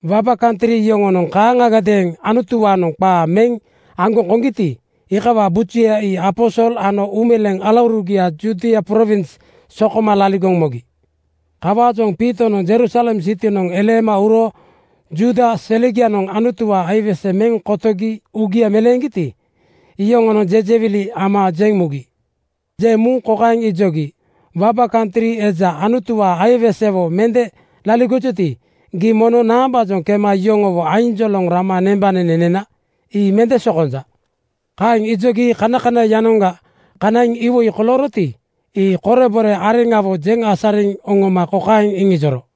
Waba kantri yoŋonoŋ kaaŋagadeeŋ Anutuwaanoŋ qaa meŋ aŋgoŋ koŋgiti, iikawaa bujuya ii aposol ano uumeleeŋ alaurugia Judia prowins sokoma laligoŋ mogi. Kawaajoŋ Piitonoŋ Jerusalem sitinoŋ eleema uro Juuda selegianoŋ Anutuwaa aiwese meŋ kotogi uugia meleeŋgiti, iyoŋonoŋ jejewili (jaaliki) ama jeŋ mugi. Jeŋ muŋ kokaeŋ ijogi, “Waba kantri eja Anutuwaa aiwesewo mende laligojuti, gii mono naambaajoŋ kema yoŋowo ainjoloŋ rama nembanene nena? Ii mende sokonja.” Kaeŋ ijogi kanakanai-yanoŋga kanaiŋ iwoi kolooroti, ii korebore areŋawo jeŋ asariŋ oŋoma kokaeŋ iŋijoro,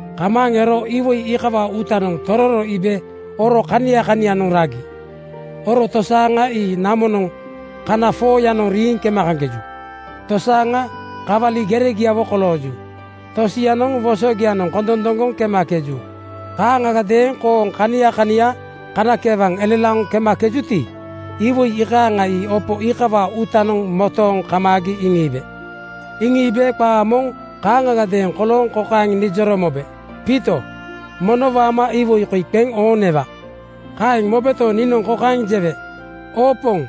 Kamaaŋ ero iwoi iikawaa uutanoŋ tororo iibe oro kania kanianoŋ ragi. Oro tosaaŋa ii namonoŋ kana 4:yanoŋ riiŋ kemakeju. Tosaaŋa kawalia geregiawo kolooju. Tosianoŋ wosogianoŋ kondondoŋgoŋ kemakeju. Kaaŋagadeeŋ kooŋ kania kania kanakeewaŋ elelaoŋ kemakejuti, iwoi iikaaŋa ii opo iikawaa uutanoŋ motooŋ kamaagi iŋiibe. Iŋiibe qa moŋ kaaŋagadeeŋ kolooŋ kokaeŋ nijoro mobe, ‘Piito, mono waama iwoi koi qeŋ ooŋ newa.’ “Kaeŋ mobeto, niinoŋ kokaeŋ jewe, ‘Oo Poŋ,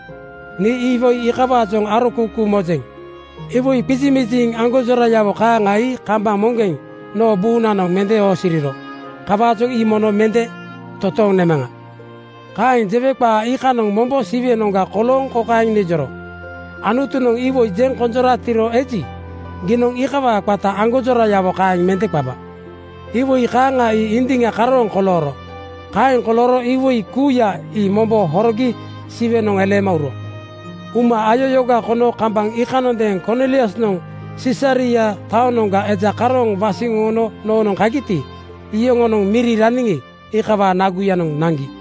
nii iikawaajoŋ arokuukuu mojeŋ. Iwoi qizimiziŋ aŋgonjorayawo kaaŋa ii kambaŋ moŋgeŋ noo buunanoŋ mende oosiriro. Kawaajoŋ ii mono mende totooŋ nemaŋa.’ Kaeŋ jewe qa iikanoŋ mombo Siwenoŋga kolooŋ kokaeŋ nijoro, ‘Anutunoŋ iwoi jeŋ konjoratiro eji, giinoŋ iikawaa qata aŋgonjorayawo kaeŋ mende qaba.’ Iwoi kaaŋa ii indiŋa karooŋ kolooro. Kaeŋ kolooro iwoi kuuya ii mombo horogi Siwenoŋ eleema uro. Uma ayayooga kono kambaŋ iikanoŋadeeŋ Korniliusnoŋ Sisaria taonoŋga eja karooŋ wasiŋ oŋono noonoŋ kagiti, iyoŋonoŋ miri raniŋi, iikawaa naguyanoŋ naŋgi.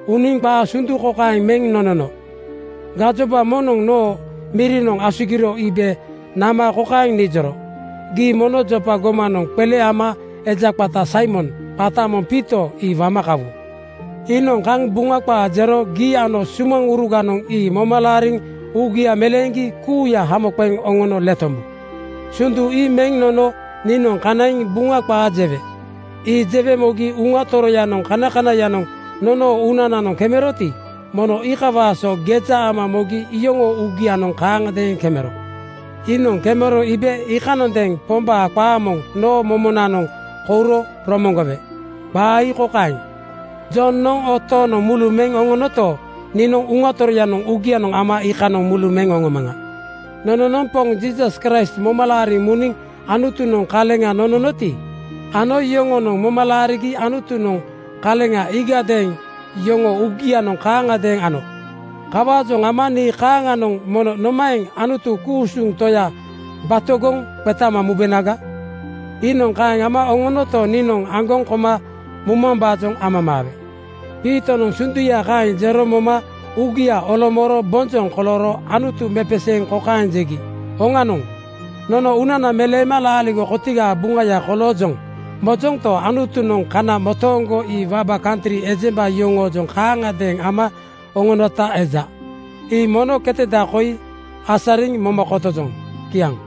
Uniŋ qaa sundu kokaeŋ meŋ nonono, ‘Gajoba moŋnoŋ noo mirinoŋ asugiro iibe nama kokaeŋ nijoro: Gii mono Jopa gomanoŋ qele ama eja qata Saimon, qata moŋ Piito ii wama kawu. Iinoŋ kaŋ Buŋa qaa jero gii ano sumaŋuruganoŋ ii moma laariŋ uugia meleeŋgi kuuya hamo qeŋ oŋono letombu.’ “Sundu ii meŋ nonono niinoŋ kanaiŋ Buŋa qaa jewe. Ii jewe mogi Uŋa Toroyanoŋ kanakanaiyanoŋ nonoo uunananoŋ kemeroti, mono iikawaa so geja ama mogi iyoŋoo uugianoŋ kaaŋgadeeŋ kemero. Iinoŋ kemero iibe iikanondeeŋ Pombaa qaa moŋ noo momonoŋ kouro romoŋgowe. Qaa ii kokaeŋ, ‘Jonoŋ oo tooŋnoŋ mulu meŋ oŋonoto, niinoŋ Uŋa Toroya uugianoŋ ama iikanoŋ mulu meŋ oŋomaŋa.’ Nononoŋ Poŋ Jiisas Kraist moma laariŋ muniŋ Anutunoŋ kaleŋa nononoti, ano yoŋonoŋ moma laarigi Anutunoŋ kaleŋa iigadeeŋ yoŋoo uugianoŋ kaaŋagadeeŋ ano. Kawaajoŋ ama nii kaaŋanoŋ mono nomaeŋ Anutu ku-usuŋ Toya batogoŋ qetama mubenaga? Iinoŋ kaeŋ ama oŋonota niinoŋ aŋgoŋ koma mumambaajoŋ amamaawe.” Piitonoŋ sunduya kaeŋ jero moma uugia olomooro bonjoŋ kolooro Anutu mepeseeŋ kokaeŋ jegi, “Oŋanoŋ, nono uunana meleema laaligo kotigaa buŋaya koloojoŋ mojonto, Anutunoŋ kana motooŋgo ii waba kantri ejemba yoŋoojoŋ kaaŋagadeeŋ ama oŋonota eja. Ii mono keteda koi asariŋ moma kotojoŋ.” Kiaŋ.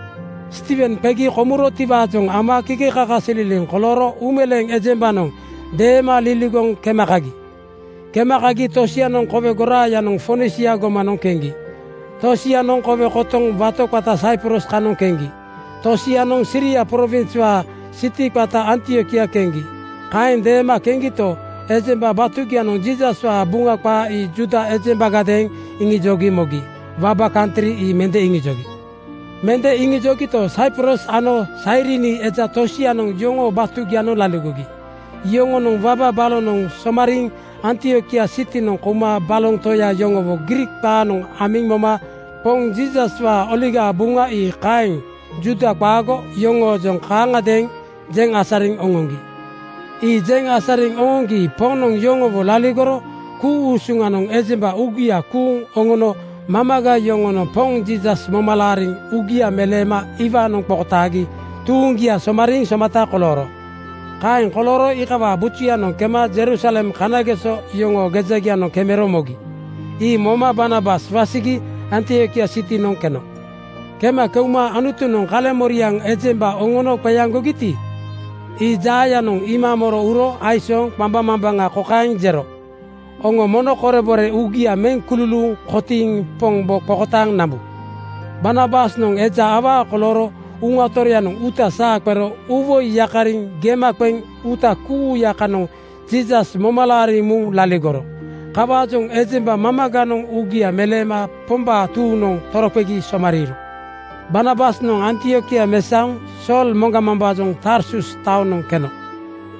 Stiiwen qegi komurotiwaajoŋ ama kakasililiŋ kolooro uumeleeŋ ejembanoŋ deema liligoŋ kema kagi. Kema kagi tosianoŋ kowe goraayanoŋ Fonisia gomanoŋ keŋgi. Tosianoŋ kowe kotoŋ wato qata Saiprus kanoŋ keŋgi. Tosianoŋ Siria prowinswaa sitia qata Antiokia keŋgi. Kaeŋ deema keŋgito, ejemba batugianoŋ Jiisaswaa Buŋa qaa ii Juuda ejembagadeeŋ iŋijogi mogi. Waba kantri ii mende iŋijogi. Mende iŋijogito, Saiprus ano Sairini eja tosianoŋ yoŋoo batugianoŋ laligogi. Yoŋonoŋ waba balonoŋ somariiŋ Antiokia sitinoŋ kouma baloŋ toya yoŋowo Griik qaanoŋ amiŋ moma Poŋ Jiisaswaa Oligaa Buŋa ii kaeŋ Juuda qaago yoŋoojoŋ kaaŋagadeeŋ jeŋ asariŋ oŋoŋgi. Ii jeŋ asariŋ oŋoŋgi Poŋnoŋ yoŋowo laligoro ku-usuŋanoŋ ejemba uugia kuuŋ oŋono mamaga yoŋonoŋ Poŋ Jiisas moma laariŋ uugia meleema iwaanoŋ qokotaagi tuuŋgia somariiŋ somata kolooro. Kaeŋ kolooro iikawaa bujuyanoŋ kema Jerusalem kanageso yoŋoo gejagianoŋ kemero mogi. Ii moma Barnabas wasigi Antiokia sitinoŋ keno. Kema keuma Anutunoŋ kaleŋmoriaŋa ejemba oŋono qeaŋgogiti, ii jaayanoŋ iima moro uro aisooŋ qambaŋmambaŋa kokaeŋ jero, “Oŋo mono korebore uugia meŋ kululuuŋ kotiiŋ Pombo qokotaaŋ nambu.” Barnabasnoŋ eja awaa kolooro Uŋa Toroyanoŋ uuta saa qero uuwoi yakariŋ gema qeŋ uuta kuuya kanoŋ Jiisas moma laariŋ muŋ laligoro. Kawaajoŋ ejemba mamaganoŋ uugia meleema Pombaa tuuŋnoŋ toroqegi somariiro. Barnabasnoŋ Antiokia mesaoŋ Sool moŋgamambaajoŋ Tarsus taonoŋ keno.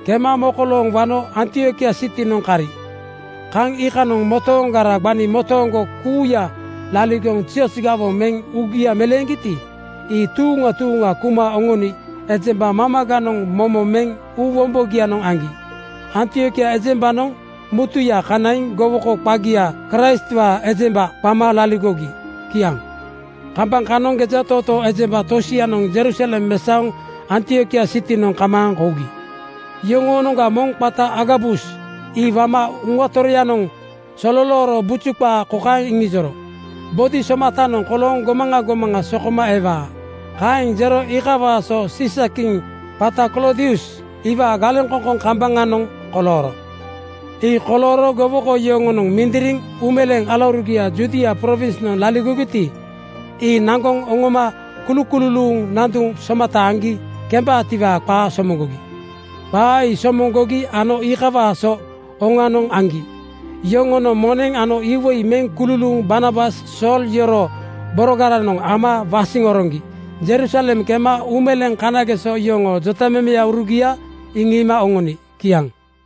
Kema mokolooŋ wano Antiokia sitinoŋ kari. Kaŋ iikanoŋ motooŋgara gbani motooŋgo kuuya laligoŋ zioz gawoŋ meŋ uugia meleeŋgiti, ii tuuŋa tuuŋa kuma oŋoni ejemba mamaganoŋ momo meŋ uu wombogianoŋ aŋgi. Antiokia ejembanoŋ mutuya kanaiŋ gowoko qagia Kraistwaa ejemba (kristen, Kraistwaa buŋa) qama laligogi. Kiaŋ. Kambaŋ kanoŋ gejatootoo ejemba tosianoŋ Jerusalem mesaoŋ Antiokia sitinoŋ kamaaŋ kougi. Yoŋoonoŋga moŋ qata Agabus ii waama Uŋa Toroyanoŋ sololooro buju qaa kokaeŋ iŋijoro, “Bodi somatanoŋ kolooŋ gomaŋa gomaŋa sokoma ewaa.” Kaeŋ jero iikawaa so Siisakiŋ qata Kloodius iwaa galeŋkoŋkoŋ kambaŋanoŋ kolooro. Ii kolooro gowoko yoŋonoŋ mindiriŋ uumeleeŋ alaurugia Judia prowinsnoŋ laligogiti, ii naŋgoŋ oŋoma kulukululuuŋ nanduŋ somata aŋgi kembaatiwaa qaa somoŋgogi. Qaa ii somoŋgogi ano iikawaa so oŋanoŋ aŋgi. Yoŋonoŋ moneŋ ano iwoi meŋ kululuuŋ Barnabas Sool yoroo borogaranoŋ ama wasiŋ oroŋgi Jerusalem kema uumeleeŋ kanageso yoŋoo jotamemeurugia iŋiima oŋoni. Kiaŋ.